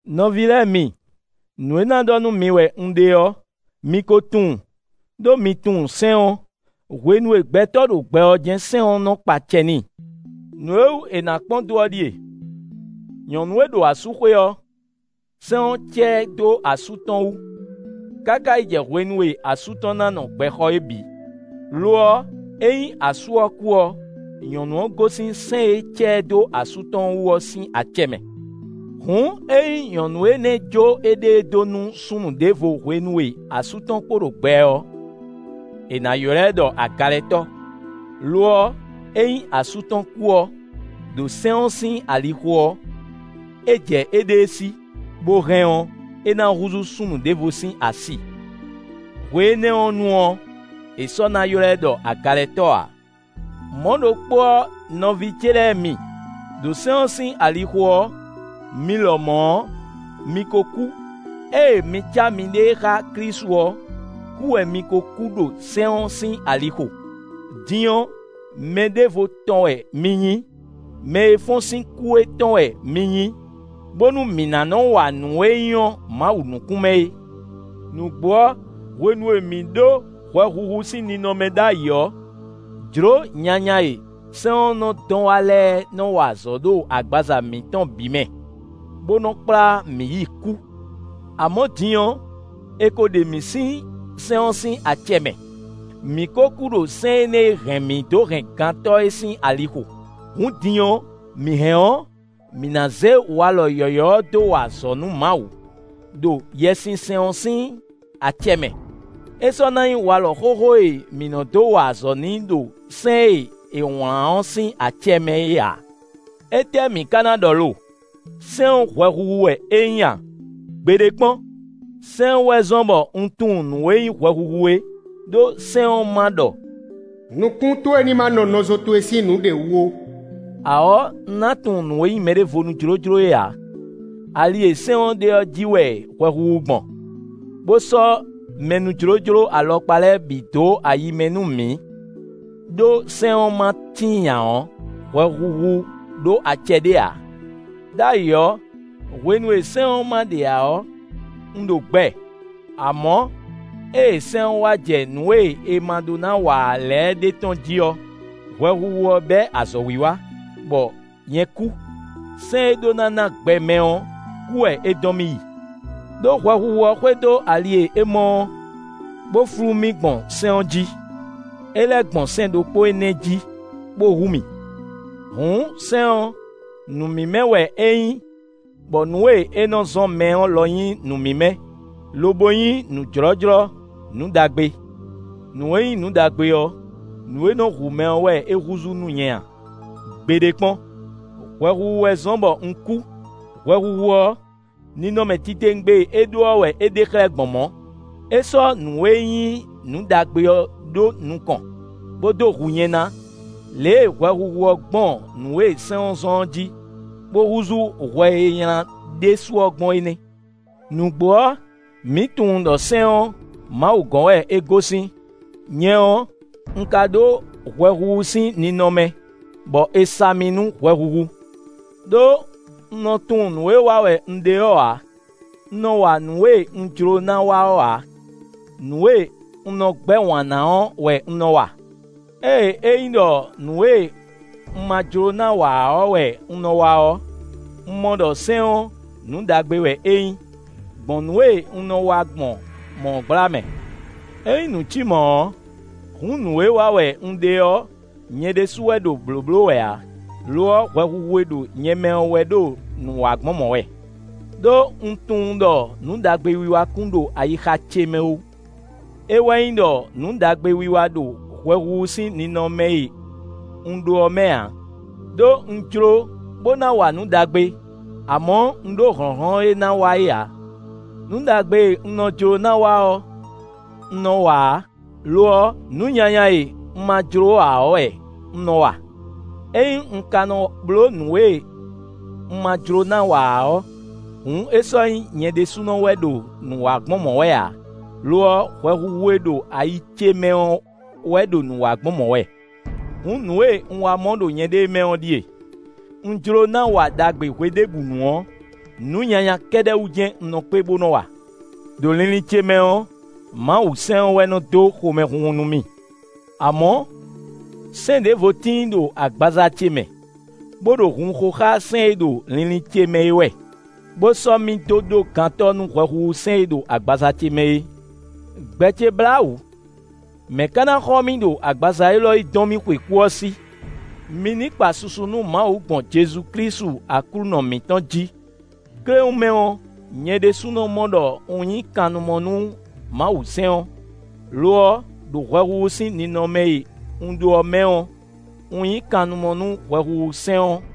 Nɔví lɛ́ɛ mi, nǔ e ná ɖɔ nú mi wɛ un ɖe ɔ́, mi ko tunwun, ɖó mi tunwun sɛ́n ɔ́. Hwenu e gbɛtɔ́ ɖo gbɛ ɔ́ jɛ́n sɛ́n ɔ́ nɔ kpa acɛ n'i. Nǔ e wú è nǎ kpɔ́n dó ɔ́ ɖíe: nyɔ̌nu e ɖo asúxwé ɔ́, sɛ́n ɔ́ cá ɛ dó asú tɔn wú, káká yi jɛ hwenu e asú tɔn ná nɔ gbɛ xɔ é bǐ; lo ɔ́, ényí asú ɔ́ kú ɔ́, nyɔ̌nu ɔ́ gosín sɛ́n e cá ɛ dó asú tɔn wú ɔ́ sín acɛ mɛ. Hǔn ényí nyɔ̌nu énɛ́ jó éɖée dó nú súnnu ɖěvo hwenu e asú tɔn kpo ɖo gbɛ ɔ́, è nǎ ylɔ́ ɛ ɖɔ agalɛtɔ́; lo ɔ́, ényí asú tɔn kú ɔ́, ɖo sɛ́n ɔ́ sín alixo ɔ́, é jɛ éɖée sí, bó hɛn ɔ́, é ná húzú súnnu ɖěvo sín asi; hwe énɛ́ ɔ́ nu ɔ́, è sɔ́ na ylɔ́ ɛ ɖɔ agalɛtɔ́ ǎ. Mɔ̌ ɖokpó ɔ́ nɔví ce lɛ́ɛ mi, ɖo sɛ́n ɔ́ sín alixo ɔ́, mi lɔmɔ̌ ɔ́, mi ko kú. Ée mi cá miɖée xá Klísu ɔ́, kú wɛ mi ko kú ɖo sɛ́n ɔ́ sín alixo. Din ɔ́, mɛ ɖěvo tɔn wɛ mi nyí; mɛ e fɔ́n sín kú é tɔn wɛ mi nyí, bónú mǐ ná nɔ́ wa nǔ e nyɔ́ Mawu nukún mɛ é. Nǔgbó ɔ́, hwenu e mǐ ɖó hwɛhuhu sín ninɔmɛ ɖ'ayǐ ɔ́, jló nyanya e sɛ́n ɔ́ nɔ dɔn wá lɛ́ɛ nɔ wa azɔ̌ ɖo agbaza mǐtɔn bǐ mɛ, bó nɔ kplá mǐ yi kú. Amɔ̌, din ɔ́, è ko ɖe mǐ sín sɛ́n ɔ́ sín acɛ mɛ; mǐ ko kú ɖo sɛ́n énɛ́ e hɛn mǐ dó hɛn gantɔ́ é sín alixo; hǔn din ɔ́, mǐ hɛn ɔ́, mǐ ná zé walɔ yɔ̌yɔ́ ɔ́ dó wa azɔ̌ nú Mawu, ɖo Yɛsinsɛn ɔ́ sín acɛ mɛ; é sɔ́ ná nyí walɔ xóxó e mǐ nɔ dó wa azɔ̌ n'i ɖo sɛ́n e è wlǎn ɔ́ sín acɛ mɛ é ǎ. Étɛ́ mǐ ka ná ɖɔ lo? Sɛ́n ɔ́ hwɛhuhu wɛ é nyí a? Gbeɖé kpɔ́n! Sɛ́n ɔ́ wɛ zɔ́n bɔ un tunwun nǔ e nyí hwɛhuhu é; ɖó sɛ́n ɔ́ ma ɖɔ: “Nukún towe ní má nɔ nɔzo towe sín nǔɖé wú ó” ǎ ɔ́, un ná tunwun nǔ e nyí mɛɖévonú jlójló é ǎ. Ali e sɛ́n ɔ́ ɖe ɔ́ jí wɛ hwɛhuhu gbɔn, bó sɔ́ mɛnújlójló alɔkpa lɛ́ɛ bǐ dó ayi mɛ nú mǐ; ɖó sɛ́n ɔ́ ma tíin ǎ ɔ́, hwɛhuhu ɖó acɛ ɖé ǎ. Đ'ayǐ ɔ́, hwenu e sɛ́n ɔ́ ma ɖe ǎ ɔ́, un ɖo gbɛ; amɔ̌, ée sɛ́n ɔ́ wá jɛ nǔ e è ma ɖó ná wa ǎ lɛ́ɛ ɖe tɔ́n jí ɔ́, hwɛhuhu ɔ́ bɛ́ azɔ̌wiwa, bɔ nyɛ kú: sɛ́n e ɖó ná ná gbɛ mɛ ɔ́, kú wɛ é dɔn mì yi. Đó hwɛhuhu ɔ́ xwedó ali e é mɔ ɔ́, bó flú mì gbɔn sɛ́n ɔ́ jí; é lɛ́ gbɔn sɛ́n ɖokpó énɛ́ jí, bó hu mì. Hǔn sɛ́n ɔ́, nǔ mímɛ́ wɛ é nyí bɔ nǔ e é nɔ zɔ́n mɛ ɔ́ lɔ nyí nǔ mímɛ́, lobo nyí nǔ jlɔ́jlɔ́, nǔ ɖagbe. Nǔ e nyí nǔ ɖagbe ɔ́, nǔ e nɔ́ hu mɛ ɔ́ wɛ é húzú nú nyɛ a? Gbeɖé kpɔ́n! Hwɛhuhu wɛ zɔ́n bɔ un kú; hwɛhuhu ɔ́, ninɔmɛ titewungbe e é ɖó ɔ́ wɛ é ɖe xlɛ́ gbɔn mɔ̌. É sɔ́ nǔ e nyí nǔ ɖagbe ɔ́ ɖó nukɔn, bó dó hu nyɛ ná. Lě e hwɛhuhu ɔ́ gbɔn nǔ e sɛ́n zɔ́n ɔ́ jí, bó húzú hwɛ e nylá ɖésú ɔ́ gbɔn é nɛ́. Nǔgbó ɔ́, mǐ tunwun ɖɔ sɛ́n ɔ́, Mawu gɔ́n wɛ é gosín; nyɛ ɔ́, un ka ɖó hwɛhuhu sín ninɔmɛ, bɔ è sa mì nú hwɛhuhu. Đó un nɔ tunwun nǔ e wa wɛ un ɖe ɔ́ ǎ; un nɔ wa nǔ e un jló ná wa ɔ́ ǎ; nǔ e un nɔ gbɛ́ wǎn ná ɔ́ wɛ un nɔ wa. Ée é nyí ɖɔ nǔ e un ma jló ná wa ǎ ɔ́ wɛ un nɔ wa ɔ́, un mɔ ɖɔ sɛ́n ɔ́, nǔ ɖagbe wɛ é nyí, gbɔn nǔ e un nɔ wa gbɔn mɔ̌ ɔ́ gbla mɛ. Ényí nǔ cí mɔ̌ ɔ́, hǔn nǔ e wa wɛ un ɖe ɔ́, nyɛ ɖésú wɛ ɖo blǒbló wɛ ǎ; lo ɔ́, hwɛhuhu e ɖo nyɛ mɛ ɔ́ wɛ ɖo nǔ wa gbɔn mɔ̌ wɛ. Đó un tunwun ɖɔ nǔ ɖagbe wiwa kún ɖo ayixa ce mɛ ó; é wɛ nyí ɖɔ nǔ ɖagbe wiwa ɖo hwɛhuhu sín ninɔmɛ e un ɖó ɔ́ mɛ ǎ; ɖó un jló bó ná wa nǔ ɖagbe; amɔ̌, un ɖó hlɔ̌nhlɔ́n e ná wa é ǎ. Nǔ ɖagbe e un nɔ jló ná wa ɔ́, un nɔ wa ǎ; lo ɔ́, nǔ nyanya e un ma jló ǎ ɔ́ wɛ un nɔ wa. Ényí un ka nɔ bló nǔ e un ma jló ná wa ǎ ɔ́, hǔn é sɔ́ nyí nyɛ ɖésúnɔ wɛ ɖo nǔ wa gbɔn mɔ̌ wɛ ǎ, lo ɔ́ hwɛhuhu e ɖo ayi ce mɛ ɔ́ wɛ ɖo nǔ wa gbɔn mɔ̌ wɛ. Hǔn, nǔ e un wá mɔ ɖo nyɛɖée mɛ ɔ́ ɖíe: un jló na wa ɖagbe hweɖěbǔnu ɔ́, nǔ nyanya kɛ́ɖɛ́ wú jɛ́n un nɔ kpé, bó nɔ wa. Đo linlin ce mɛ ɔ́, Mawusɛ́n ɔ́ wɛ nɔ dó xomɛhunhun nú mì. Amɔ̌, sɛ́n ɖěvo tíin ɖo agbaza ce mɛ, bó ɖo hun xo xá sɛ́n e ɖo linlin ce mɛ é wɛ, bó sɔ́ mì dó ɖó gantɔ́ nú hwɛhuhu sɛ́n e ɖo agbaza ce mɛ é. Gbɛ ce blá wǔ; mɛ ka na xɔ mì ɖo agbaza élɔ́ e dɔn mì xwe kú ɔ́ sí? Mi ní kpa susu nú Mawu gbɔn Jezu Klísu Aklúnɔ mǐtɔn jí. Kléwún mɛ ɔ́, nyɛ ɖésúnɔ mɔ ɖɔ un nyí kannumɔ nú Mawusɛ́n ɔ́; lo ɔ́, ɖo hwɛhuhu sín ninɔmɛ e un ɖó ɔ́ mɛ ɔ́, un nyí kannumɔ nú hwɛhuhu sɛ́n ɔ́.